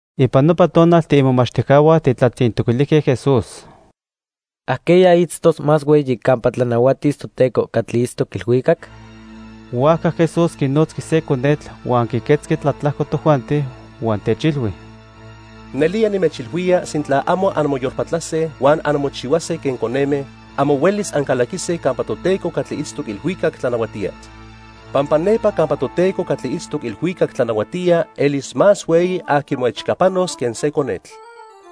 Ipan nopa tonal tiimomachtijcahua tijtlatzintoquilijque Jesús: —¿Ajqueya itztos más hueyi campa tlanahuatis Toteco catli itztoc ilhuicac? Huajca Jesús quinotzqui se conetl huan quiquetzqui tlatlajco tojuanti, huan techilhui: —Nelía nimechilhuía sintla amo anmoyolpatlase huan anmochihuase quen coneme, amo huelis ancalaquise campa Toteco catli itztoc ilhuicac tlanahuatía. Pampa nepa campa Toteco catli itztoc ilhuicac tlanahuatía elis más hueyi aqui moechcapanos quen se conetl.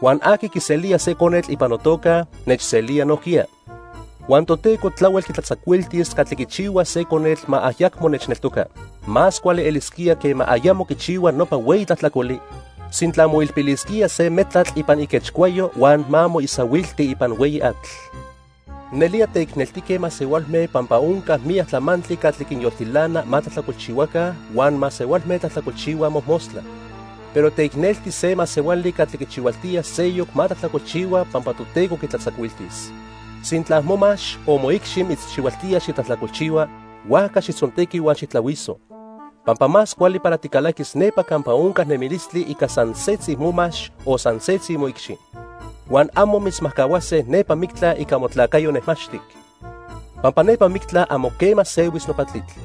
Huan aqui quiselía se conetl ipan notoca nechselía nojquiya. "Huan Toteco tlahuel quitlatzacuiltis catli quichihuas se conetl ma ayacmo nechneltoca. Más cuali elisquía quema ayamo quichihua nopa hueyi tlajtlacoli, sintla moilpilisquía se metlatl ipan iquechcuayo huan ma moisahuilti ipan hueyi atl. Nelía teicneltique masehualme pampa onca miyac tlamantli catli quinyoltilana ma tlajtlacolchihuaca huan masehualme tlajtlacolchihuaj mojmostla. Pero teicnelti se masehuali catli quichihualtía seyoc ma tlajtlacolchihua pampa Toteco quitlatzacuiltis. "Sintla momax o moicxi mitzchihualtía xitlajtlacolchihua, huajca xijtzontequi huan xijtlahuiso. Pampa más cuali para ticalaquis nepa campa onca nemilistli ica san setzi momax o san setzi moicxi, huan amo mitzmajcahuase nepa mictla ica motlacayo nejmaxtic. Pampa nepa mictla amo quema sehuis nopa tlitl.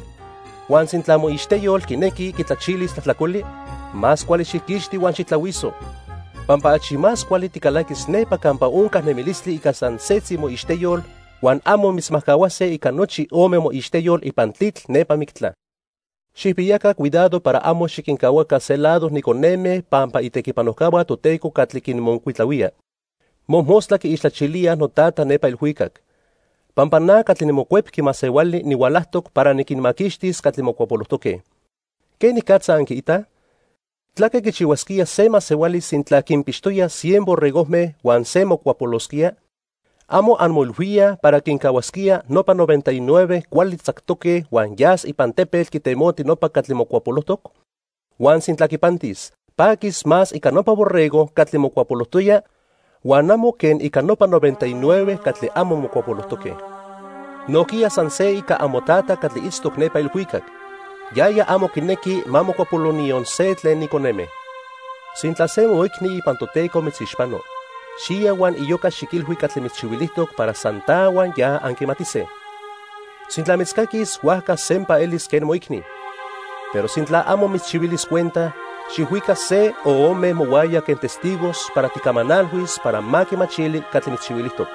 Huan sintla moixteyol quinequi quitlachilis tlajtlacoli, más cuali xijquixti huan xijtlahuiso. Pampa achi más cuali ticalaquis nepa campa onca nemilistli ica san setzi moixteyol huan amo mitzmajcahuase ica nochi ome moixteyol ipan tlitl nepa mictla. "Xijpiyaca cuidado para amo xiquincahuaca se lado ni coneme pampa itequihuajcahua Toteco catli quinmocuitlahuíaj, mojmostla quiixtlachilíaj noTata nepa ilhuicac. Pampa na catli niMocuepqui Masehuali nihualajtoc para niquinmaquixtis catli mocuapolojtoque. "¿Quenicatza anquiitaj? ¿Tlaque quichihuasquía se masehuali sintla quinpixtoya cien borregojme huan se mocuapolosquía? ¿Amo anmoilhuíaj para quincahuasquía nopa noventa y nueve cuali tzactoque huan yas ipan tepetl quitemoti nopa catli mocuapolojtoc? Huan sintla quipantis, paquis más ica nopa borrego catli mocuapolojtoya huan amo quen ica nopa noventa y nueve catli amo mocuapolojtoque. Nojquiya san se ica amoTata catli itztoc nepa ilhuicac. Yaya amo quinequi ma mocuapolo niyon se tlen ni coneme. "Sintla se moicni ipan Toteco mitzixpano, xiya huan iyoca xiquilhui catli mitzchihuilijtoc para san ta huan ya anquimatise. Sintla mitzcaquis huajca sempa elis quen moicni. Pero sintla amo mitzchihuilis cuenta, xijhuica se o ome mohuaya quen testigos para tijcamanalhuis para ma quimachili catli mitzchihuilijtoc,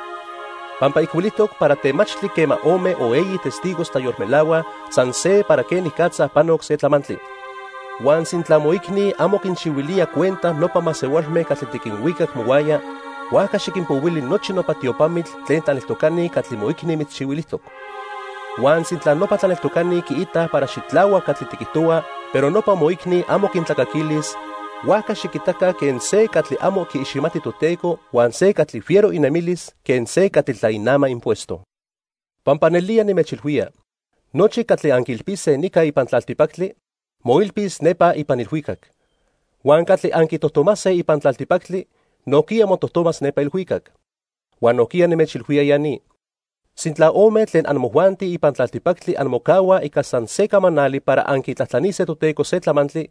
pampa ijcuilijtoc para temachtli quema ome o eyi testigos tlayolmelahuaj san se para quenicatza panoc se tlamantli. Huan sintla moicni amo quinchihuilía cuenta nopa masehualme catli tiquinhuicac mohuaya, huajca xiquinpohuili nochi nopa tiopamitl tlen tlaneltocani catli moicni mitzchihuilijtoc. Huan sintla nopa tlaneltocani quiitaj para xitlahuac catli tiquijtohua pero nopa moicni amo quintlacaquilis, huajca xiquitaca quen se catli amo quiiximati Toteco huan se catli fiero inemilis quen se catli tlainama impuesto. "Pampa nelía nimechilhuía, nochi catli anquiilpise nica ipan tlaltipactli, moilpis nepa ipan ilhuicac. Huan catli anquitojtomase ipan tlaltipactli nojquiya motojtomas nepa ilhuicac. "Huan nojquiya nimechilhuía ya ni, sintla ome tlen amojuanti ipan tlaltipactli anmocahuaj ica san se camanali para anquitlajtlanise Toteco se tlamantli,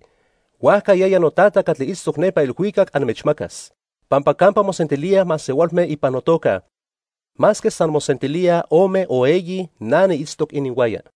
huajca yaya noTata catli itztoc nepa ilhuicac anmechmacas. Pampa campa mosentilíaj masehualme ipan notoca, masque san mosentilíaj ome o eyi, na niitztoc ininhuaya."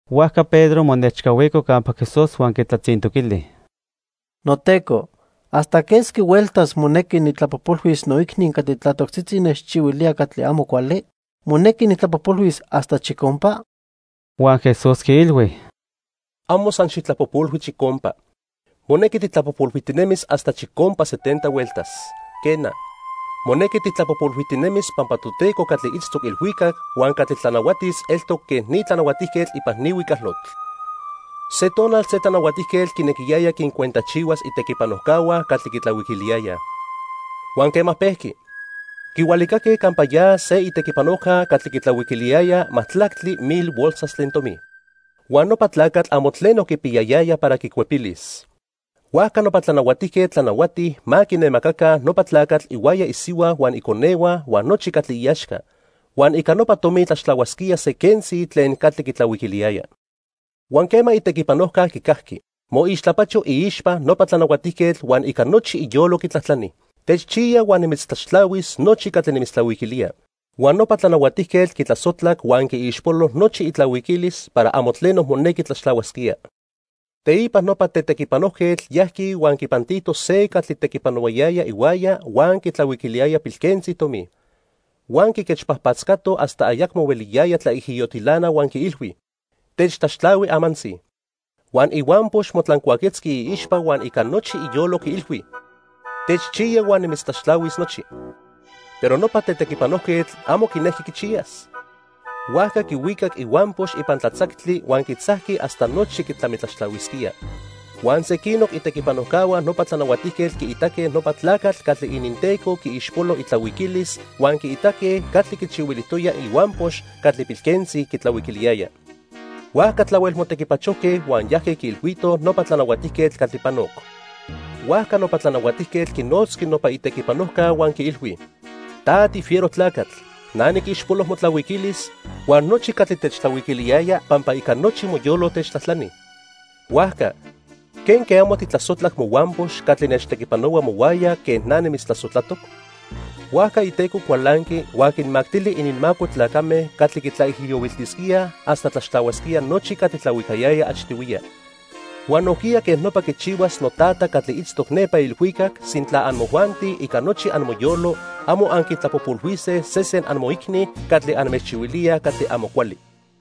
Huajca Pedro monechcahuico campa Jesús huan quitlatzintoquili: —NoTeco, ¿hasta quesqui hueltas monequi nijtlapojpolhuis noicni catli tlatoctzitzi nechchihuilía catli amo cuali? ¿Monequi nijtlapojpolhuis hasta chicompa? Huan Jesús quiilhui: —Amo san xijtlapojpolhui chicompa. Monequi tijtlapojpolhuijtinemis hasta chicompa setenta hueltas. "Quena, monequi tijtlapojpolhuijtinemis pampa Toteco catli itztoc ilhuicac huan catli tlanahuatis eltoc quen ni tlanahuatijquetl ipan ni huicalotl. Se tonal se tlanahuatijquetl quinequiyaya quincuentajchihuas itequipanojcahua catli quitlahuiquiliyayaj. Huan quema pejqui, quihualiquilijque campa ya se itequipanojca catli quitlahuiquiliyaya majtlactli mil bolsas tlen tomi. Huan nopa tlacatl amo tleno quipiyayaya para quicuepilis. Huajca nopa tlanahuatijquetl tlanahuati ma quinemacaca nopa tlacatl ihuaya isihua huan iconehua huan nochi catli iaxca, huan ica nopa tomi tlaxtlahuasquía se quentzi tlen catli quitlahuiquiliyaya. "Huan quema itequipanojca quicajqui, moixtlapacho iixpa nopa tlanahuatijquetl huan ica nochi iyolo quitlajtlani: 'Techchiya huan nimitztlaxtlahuis nochi catli nimitztlahuiquilía.' Huan nopa tlanahuatijquetl quitlasojtlac huan quiixpolo nochi itlahuiquilis para amo tleno monequi tlaxtlahuasquía. "Teipa nopa tetequipanojquetl yajqui huan quipantito se catli tequipanohuayaya ihuaya huan quitlahuiquiliyaya pilquentzi tomi. Huan quiquechpajpatzcato hasta ayacmo hueliyaya tlaijiyotilana huan quiilhui: 'Techtlaxtlahui amantzi.' "Huan ihuampox motlancuaquetzqui iixpa huan ica nochi iyolo quiilhui: 'Techchiya huan nimitztlaxtlahuis nochi.' "Pero nopa tetequipanojquetl amo quinejqui quichiyas. Huajca quihuicac ihuampox ipan tlatzactli huan quitzajqui hasta nochi quitlamitlaxtlahuisquía. Huan sequinoc itequipanojcahua nopa tlanahuatijquetl quiitaque nopa tlacatl catli ininteco quiixpolo itlahuiquilis huan quiitaque catli quichihuilijtoya ihuampox catli pilquentzi quitlahuiquiliyaya. Huajca tlahuel motequipachojque huan yajque quiilhuitoj nopa tlanahuatijquetl catli panoc. "Huajca nopa tlanahuatijquetl quinotzqui nopa itequipanojca huan quiilhui: 'Ta tifiero tlacatl. Na niquixpolo motlahuiquilis huan nochi catli techtlahuiquiliyaya pampa ica nochi moyolo techtlajtlani. Huajca ¿quenque amo tijtlasojtlac mohuampox catli nechtequipanohua mohuaya quen na nimitztlasojtlac?' Huajca iteco cualanqui huan quinmactili ininmaco tlacame catli quitlaijiyohuiltisquíaj hasta tlaxtlahuasquía nochi catli tlahuicayaya achtihuiya. Huan nojquiya quej nopa quichihuas noTata catli itztoc nepa ilhuicac sintla amojuanti ica nochi amoyolo amo anquintlapojpolhuise sesen amoicni catli anmechchihuilíaj catli amo cuali."